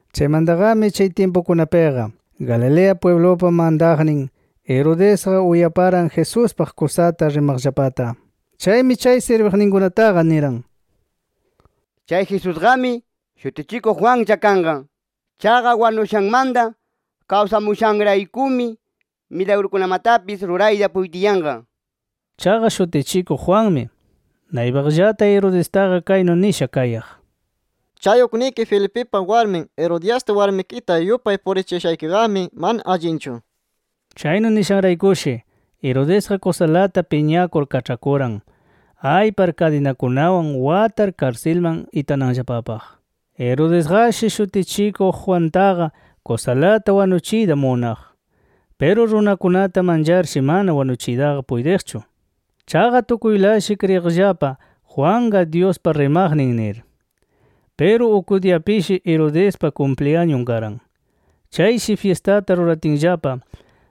Chaymantaqami chay tyimpukunapiqa Galilea pwiblupa mantaqnin, Herodesqa uyaparan Jesuspaq kusata rimaqllapata. Chaymi chay sirbiqninkunataqa niran: “Chay Jesusqami, Shutichikuq Juanlla kanqa. Chaqa wanushanmanta kawsamushanraykumi milagrukunamatapis rurayta puytiyanqa” nir. Chaqa Shutichikuq Juanmi naypaqllata Herodestaqa kaynu nisha kayaq: “Chay ukniki Felipipa warmin Herodiasta warmikita yupay purichiyashaykiqami mana allinchu”. Chaynu nishanraykushi Herodesqa kusalata piñakur kaĉhakuran aypar kadinakunawan watar karsilman itananllapapaq. Herodesqashi, Shutichikuq Juantaqa kusalata wanuchiyta munaq. Piru runakunata mancharshi mana wanuchiytaqa puytiqchu. Chaqa tukuylashi kriyiqllapa Juanqa Dyuspa rimaqnin nir. Piru uk diyapishi Herodespa kumpliyañun karan. Chayshi fyistata ruratinllapa,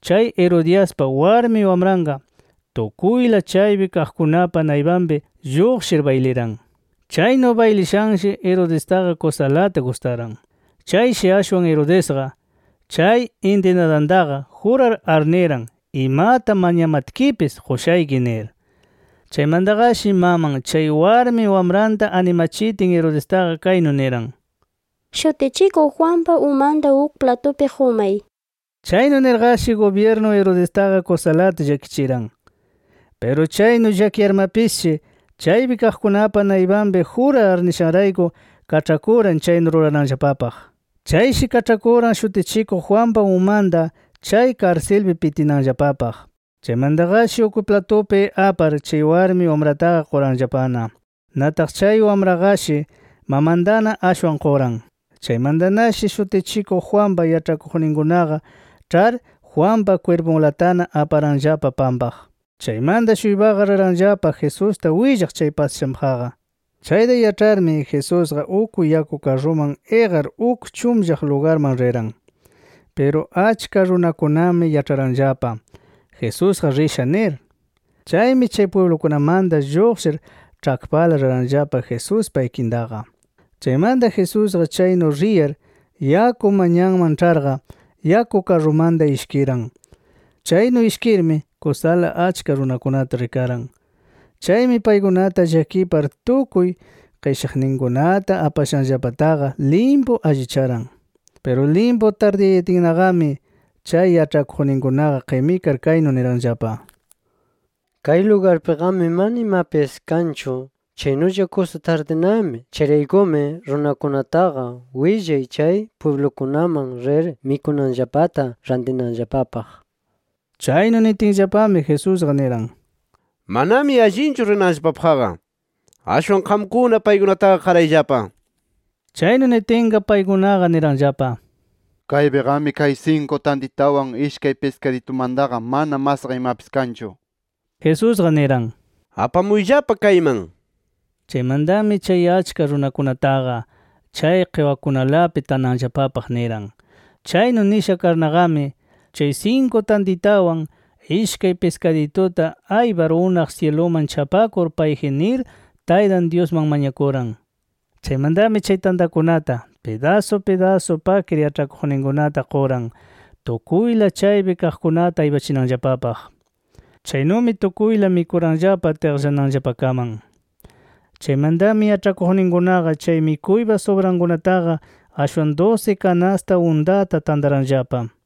chay Herodiaspa warmi wamranqa tukuyla chaypi kaqkunapa naypanpi lluqshir bayliran. Chaynu baylishanshi Herodestaqa kusalata gustaran. Chayshi ashwan Herodesqa chay intinadantaqa jurar arniran imata mañamatkipis qushayki nir. Chaymantaqashi maman chay warmi wamranta animachitin Herodestaqa kaynu niran: “Shutichikuq Juanpa umanta uk platupi qumay” nir. Chaynu nirqashi gubyirnu Herodestaqa kusalata llakichiran. Piru chaynu llakiyarmapisshi, chaypi kaqkunapa naypanpi jurar arnishanrayku kaĉhakuran chaynu rurananllapapaq. Chayshi kaĉhakuran Shutichikuq Juanpa umanta chay karsilpi pitinanllapapaq. Chaymantaqashi uk platupi apar, chay warmi wamrataqa quranllapana. Nataq chay wamraqashi mamantana ashwan quran. Chaymantanashi, Shutichikuq Juanpa yaĉhakuqninkunaqa ĉhar, Juanpa kwirpunlatana aparanllapa pampaq. Chaymanta-shuypaqa riranllapa Jesusta willaq chay pasashanpaqqa. Chayta yaĉharmi Jesusqa uk yaku karruman iqar uk chunllaq lugarman riran. Piru achka runakunami yaĉharanllapa Jesusqa risha nir. Chaymi chay pwiblukunamanta lluqshir ĉhakpala riranllapa Jesuspa ikintaqa. Chaymanta Jesusqa chaynu riyar yaku manyanman ĉharqa, yaku karrumanta ishkiran. Chaynu ishkirmi kusala achka runakunata rikaran. Chaymi paykunata llakipar tukuy qishaqninkunata apashanllapataqa limpu allicharan. Piru limpu tardiyayatinnaqami chay yaĉhakuqninkunaqa qimikar kaynu niranllapa: —Kay lugarpiqami mana imapis kanchu. Chaynulla kusa tardinami. Chayraykumi runakunataqa willay chay pwiblukunaman rir mikunanllapata rantinanllapapaq nir. Chaynu nitinllapami Jesusqa niran: —Manami allinchu rinanllapapaqqa. Ashwan qamkuna paykunataqa qarayllapa nir. Chaynu nitinqa, paykunaqa niranllapa: —Kaypiqami kay sinku tantitawan, ishkay piskaditumantaqa mana masqa imapis kanchu, nir. Jesusqa niran: —Apamuyllapa kayman. Chaymantami chay achka runakunataqa chay qiwakunalapi tananllapapaq niran. Chaynu nisha karnaqami, chay sinku tantitawan, ishkay piskadituta aypar unaq syiluman chapakur payji nir, Taytan Dyusman mañakuran. Chaymantami chay tantakunata pidasu pidasu pakir yaĉhakuqninkunata quran tukuyla chaypi kaqkunata aypachinanllapapaq. Chaynumi tukuyla mikuranllapa tiqllananllapakaman. Chaymantami yaĉhakuqninkunaqa chay mikuypa subrankunataqa ashwan dusi kanasta untata tantaranllapa.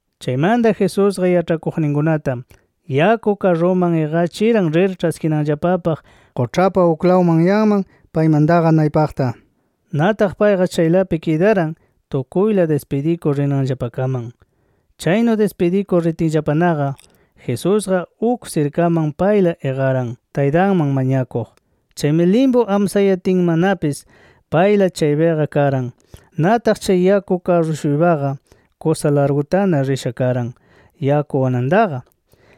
Chaymanta, Jesusqa yaĉhakuqninkunata yaku karruman iqachiran rir ĉhaskinanllapapaq quĉhapa uklaw manyanman paymantaqa naypaqta. Nataq payqa chaylapi kidaran tukuyla dispidikur rinanllapakaman. Chaynu dispidikur ritinllapanaqa, Jesusqa uk sirkaman payla iqaran, Taytanman mañakuq. Chaymi limpu amsayatinnamapis payla chaypiqa karan. Nataq chay yaku karru-shuypaqa kusa largutana risha karan yaku anantaqa.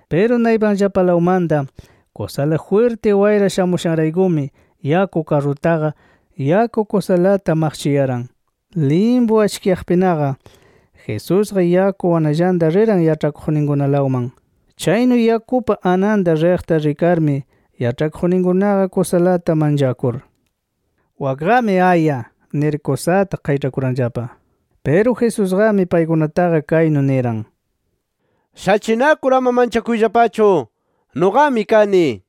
Piru naypanllapalawmanta kusala jwirti wayra shamuyashanraykumi yaku karrutaqa, yaku kusalata maqchiyaran. Limpu achkiyaqpinaqa, Jesusqa yaku ananllata riran yaĉhakuqninkunalawman. Chaynu yakupa ananta riqta rikarmi yaĉhakuqninkunaqa kusalata manchakur “¡Wakqami aya!” nir kusata qayĉhakuranllapa. Piru Jesusqami paykunataqa kaynu niran: —¡Shachinakur ama manchakuyllapachu! ¡Nuqami kani! nir.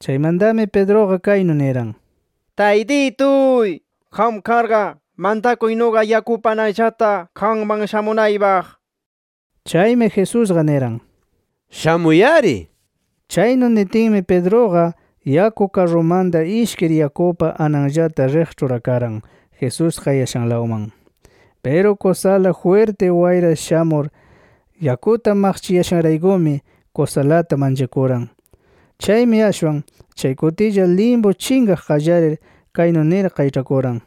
Chaymantami, Pedruqa kaynu niran: —Taytituy, qam karqa mantakuy nuqa yakupa ananllata qamman shamunaypaq nir. Chaymi Jesusqa niran: —Shamuy-ari nir. Chaynu nitinmi Pedruqa yaku karrumanta ishkir yakupa ananllata riq ĉhurakaran Jesús kayashanlawman. Piru kusala jwirti wayra shamur yakuta maqchiyashanraykumi kusalata manchakuran. Chaymi ashwan chay kutilla limpu chinqaq qallarir, kaynu nir qayĉhakuran: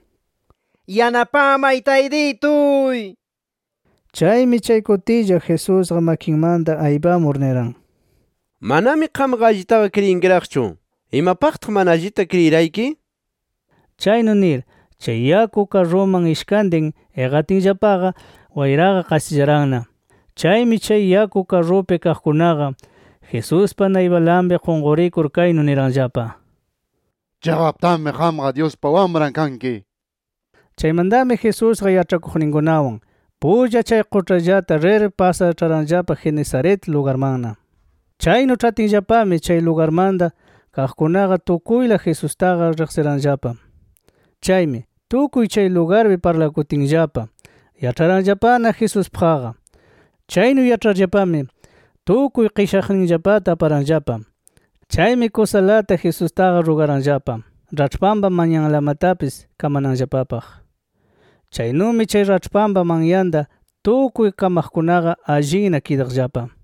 —¡Yanapamay Taytituy! nir. Chaymi chay kutilla Jesusqa makinmanta aypamur niran: —¡Manami qamqa allitaqa kriyinkiraqchu! ¿Imapaqtaq mana allita kriyirayki? nir. Chaynu nir chay yaku karruman ishkantin iqatinllapaqa, wayraqa qasillaranna. Chaymi, chay yaku karrupi kaqkunaqa, Jesuspa naypalanpi qunqurikur kaynu niranllapa: —¡Chiqaptami qamqa Dyuspa Wamran kanki! nir. Chaymantami Jesusqa yaĉhakuqninkunawan pulla chay quĉhallata rir pasar, ĉharanllapa Genesaret lugarmanna. Chaynu ĉhatinllapami chay lugarmanta kaqkunaqa tukuyla Jesustaqa riqsiranllapa. Chaymi, tukuy chay lugarpi parlakutinllapa, yaĉharanllapana Jesuspaqqa. Chaynu yaĉharllapami tukuy qishaqninllapata aparanllapa. Chaymi kusalata Jesustaqa rugaranllapa raĉhpanpa manyanlamatapis kamananllapapaq. Chaynumi chay raĉhpanpa manyanta tukuy kamaqkunaqa allinna kidaqllapa.